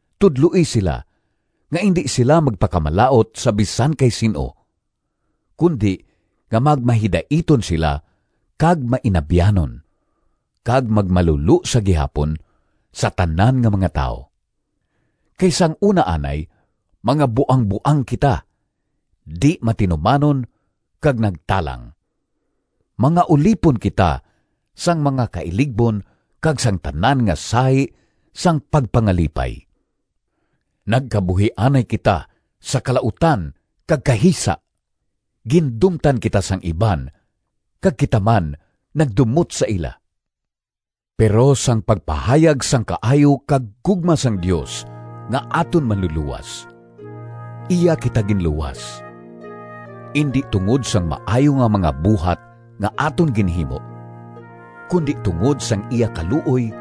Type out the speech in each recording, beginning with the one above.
Tudloi sila nga indi sila magpakamalaut sa bisan kay sin-o, kundi nga magmahidaiton sila kag mainabyanon, kag magmalulo sa gihapon sa tanan nga mga tawo. Kay sang una anay, mga buangboang kita, di-matinumanon kag nagtalang. Mga ulipon kita sang mga kailigbon kag sang tanan nga sahi sang pagpangalipay. Nagkabuhi anay kita sa kalautan kag kahisa. Gindumtan kita sang iban kag kita man nagdumot sa ila. Pero sang pagpahayag sang kaayo kag gugma sang Dios nga aton Manlulowas, iya kita ginluwas. Indi tungod sang maayo nga mga buhat nga aton ginhimo, kundi tungod sang iya kaluoy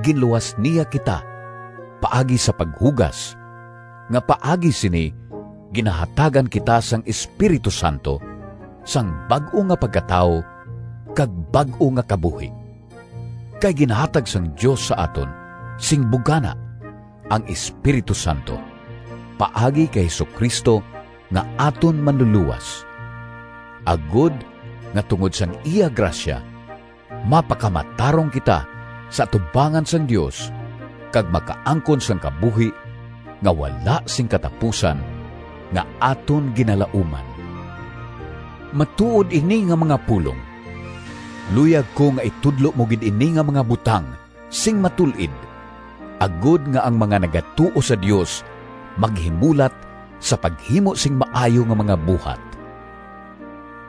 ginluwas niya kita paagi sa paghugas, nga paagi sini ginahatagan kita sang Espiritu Santo sang bag-o nga pagkatawo kag bag-o nga kabuhi. Kay ginhatag sang Dios sa aton sing bugana ang Espiritu Santo, paagi kay Jesu-Cristo nga aton Manlulowas, agod nga tungod sang iya grasya mapakamatarong kita sa atubangan sang Dios, kag makaangkon sang kabuhi nga wala sing katapusan nga aton ginalauman. Matuod ini nga mga pulong. Luyag ko nga itudlo mo gid ini nga mga butang sing matul-id, agod nga ang mga nagatuo sa Dios maghimulat sa paghimo sing maayo nga mga buhat.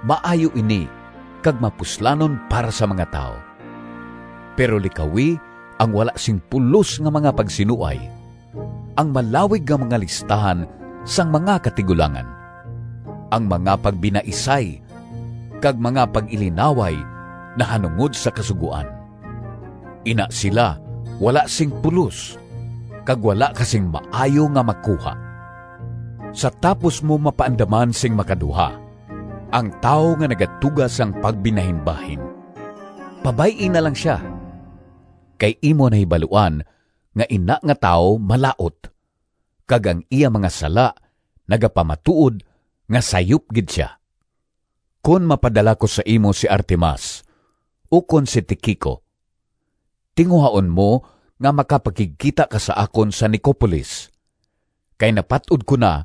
Maayo ini kag mapuslanon para sa mga tawo. Pero likawi ang wala sing pulos nga mga pagsinuay, ang malawig nga mga listahan sang mga katigulangan, ang mga pagbinaisay, kag mga pag-ilinaway nahanungod sa Kasugoan. Ina sila wala sing pulos kag wala ka sing maayo nga makuha. Sa tapos mo mapaandaman sing makaduha ang tawo nga nagatuga sang pagbinahinbahin, pabay-i na lang sia. Kay imo nahibaluan nga ina nga tawo malaut, kag ang iya mga sala nagapamatuod nga sayop gid sia. Kon mapadala ko sa imo si Artemas ukon si Tiquico, tinguhaon mo nga makapakigkita ka sa akon sa Nicopolis, kay napat-od ko na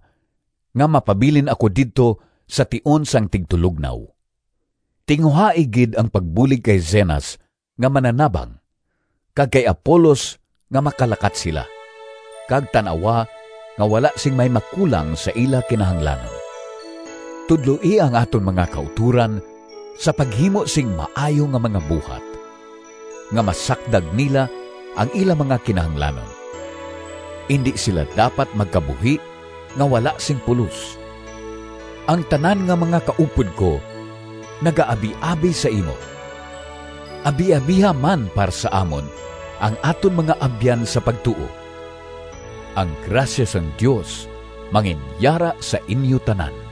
nga mapabilin ako didto sa tion sang tigtulognaw. Tinguhai gid ang pagbulig kay Zenas nga mananabang kag kay Apolos nga makalakat sila, kag tan-awa nga wala sing may makulang sa ila kinahanglanon. Tudloi ang aton mga kautoran sa paghimo sing maayo nga mga buhat, nga masakdag nila ang ila mga kinahanglanon. Indi sila dapat magkabuhi nga wala sing pulos. Ang tanan nga mga kaupod ko nagaabiabi sa imo. Abiabiha man para sa amon ang aton mga abyan sa pagtuo. Ang grasya sang Dios manginyara sa inyo tanan.